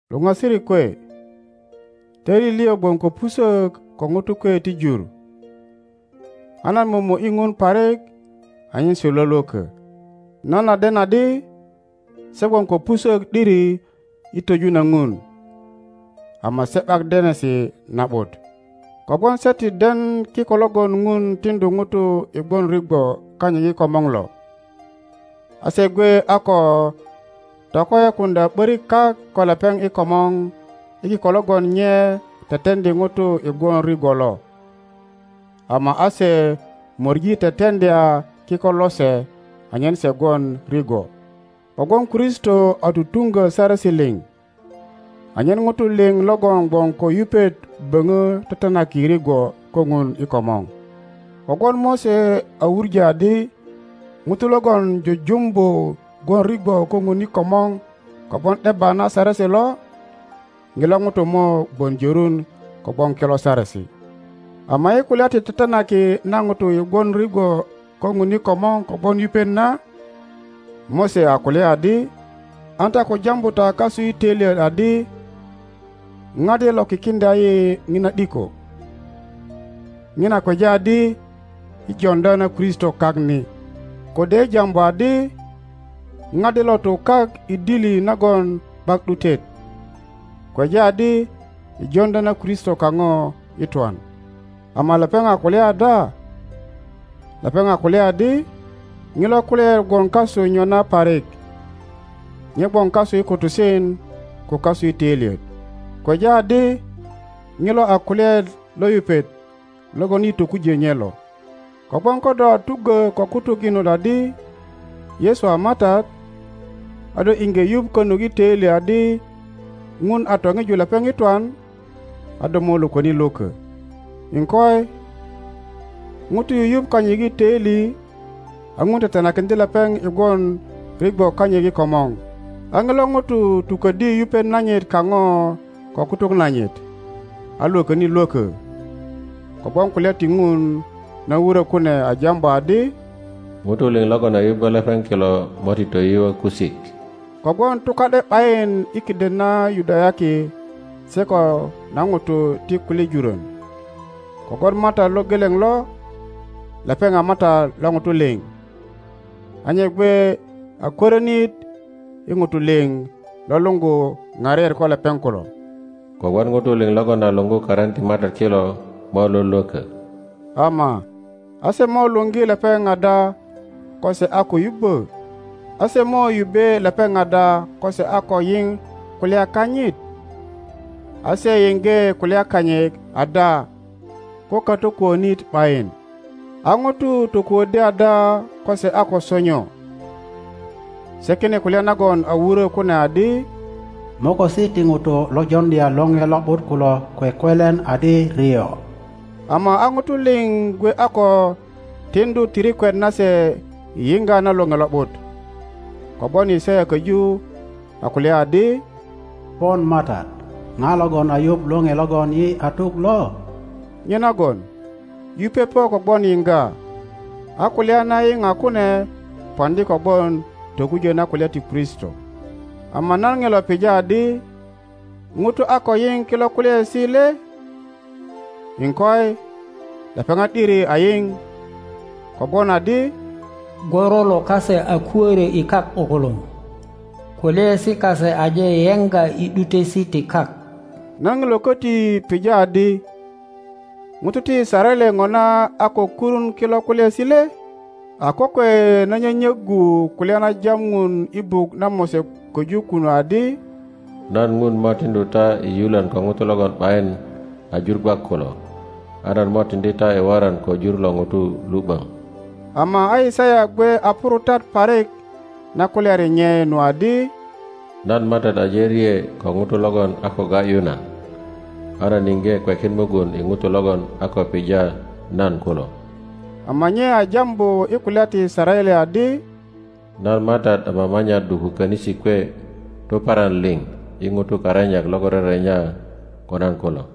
Luŋasirik kwe, töili liŋ gwon ko pusök ko ŋutu kwe ti jur, a nan momo ’yi Ŋun parik anyen se lwölwökö. Nan a den adi se gwon ko pusök ’diri i twöju na Ŋun, ama se ’bak denesi na ’but. Kogwon se ti den kiko logon Ŋun tiŋdu ŋutu i gwon rigwo kanyit i komor lo, a se gwe a ko tokoyokuŋdya ’börik kak ko lepeŋ i komor i kiko logon nye teteŋdi ŋutu i gwon rigwo lo, ama a se möŋi teteŋdya kiko lose anyen se gwon rigwo. Kogwon Kristo a tutuŋgö saresi liŋ, anyen ŋutu liŋ logon gwon ko yupet boŋo tetenaki rigwo ko Ŋun i komor. Kogwon Mose a wuŋö adi ŋuto logon jujumbu gwon rigwo ko Ŋun i komor kogwon ’debba na saresi lo, ŋilo ŋuto mo gwon jörun kogwon kilo saresi. Ama i kulya ti tetenaki na ŋutu i gwon rigwo ko Ŋun i komor kogwon yupet na, Mose a kulya adi, An ta ko jambu ta kasu i töilyet adi, Ŋa de lo kikiŋdya yi ŋiua ’diko? (ŋina kweja adi i joŋdya na Kristo kak ni.) Kode, i jambu adi, Ŋa de lo tu kak i dili nagon ’bak ’dutet? (kweja adi, i joŋdya na Kristo kaŋo i twan.) Ama lepeŋ a kulya ada? Lepeŋ a kulya adi, Ŋilo kulyaet gwon kasu nyona parik, nye gwon kasu i kutusen ko kasu i töilyet. (Kweja adi, ŋilo a kulyaet lo yupet logon yi tokujö nye lo.) Kogwon ko do a tuggö ko kutuk inot adi, Yesu a Matat, a do iŋge yuŋ konut i töili adi Ŋun a toŋiju lepeŋ i twan, a do mo lwököni lwökö. Iŋkoi, ŋuto yuyuŋ kanyit i töili a Ŋun tetenakiŋdye lepeŋ i gwon rigwo kanyit i komor, a ŋilo ŋuto tuköddi yupet nanyit kaŋo ko kutuk nanyit a lwököni lwökö. Kowon kulya ti Ŋun na wurö kune a jambu adi, Ŋutu liŋ logon a yubbö lepeŋ kilo mo ti toyuö kusik. Kogwon tuka ’de ’bayin i kiden na Yudayaki se ko na ŋutu ti kulye jurön, kogwon Matat lo geleŋ lo, lepeŋ a Matat lo ŋutu liŋ, a nye gwe a kwörinit i ŋutu liŋ lo luŋgu ŋariet ko lepeŋ kulo. Kogwon ŋutu liŋ logon a luŋgu karin ti Matat kilo mo lwölwökö. Ama a se mo luŋgi lepeŋ ada ko se a ko yubbö? A se mo yubbe lepeŋ ada ko se a ko yiŋ kulya kanyit? A se yiŋge kulya kanyit ada ko katokuönit ’bayin? A ŋutu tokuöddi ada ko se a ko sonyo? Sekine kulya nagon a wurö kune adi, Mokosi ti ŋutu lo joŋdya lore lo ’but kulo kwekwelen adi rio! Ama a ŋutu liŋ gwe a ko tiŋdu tirikwet nase i yiŋga na lore lo ’but. Kogwon Yisaya köju a kulya adi, Pon Matat, ŋa logon a yuŋ lore logon yi a tuk lo? Nyenagon yupet po kogwon yiŋga, a kulya na yiŋa kune poŋdi kogwon tokujö na kulya ti Kristo. Ama nan ŋilo pija adi, ŋutu a ko yiŋ kilo kulyaesi le? Iŋkoi, lepeŋat ’diri a yiŋ, kogwon adi, Gworolo kase a kuörö i kak ’bukuluŋ, kulyaesi kase aje yeŋga i ’dutesi ti kak. Nan ŋilo köti pija adi, ŋutu ti Yisaraele ŋona a ko kurun kilo kulyaesi le? A kokwe na nyönyöggu kulya na jam Ŋun i buk na Mose köju kunu adi, Nan Ŋun mo tiŋdu ta i yulön ko ŋutu logon ’bayin a jur gwak kulo, a nan mo tiŋdi ta i woran ko jur lo ŋutu lu ’böŋ. Ama a Yisaya gwe a purutat parik na kulyari nye nu adi, Nan Matat aje rye ko ŋutu logon a ko ga ’yu nan, a nan iŋge kwekin mugun i ŋutu logon a ko pija nan kulo. Ama nye a jambu i kulya ti Yisaraele adi, Nan Matat a mama nya dduko könisi kwe tuparan liŋ i ŋutu karenyak logon rerenya ko nan kulo.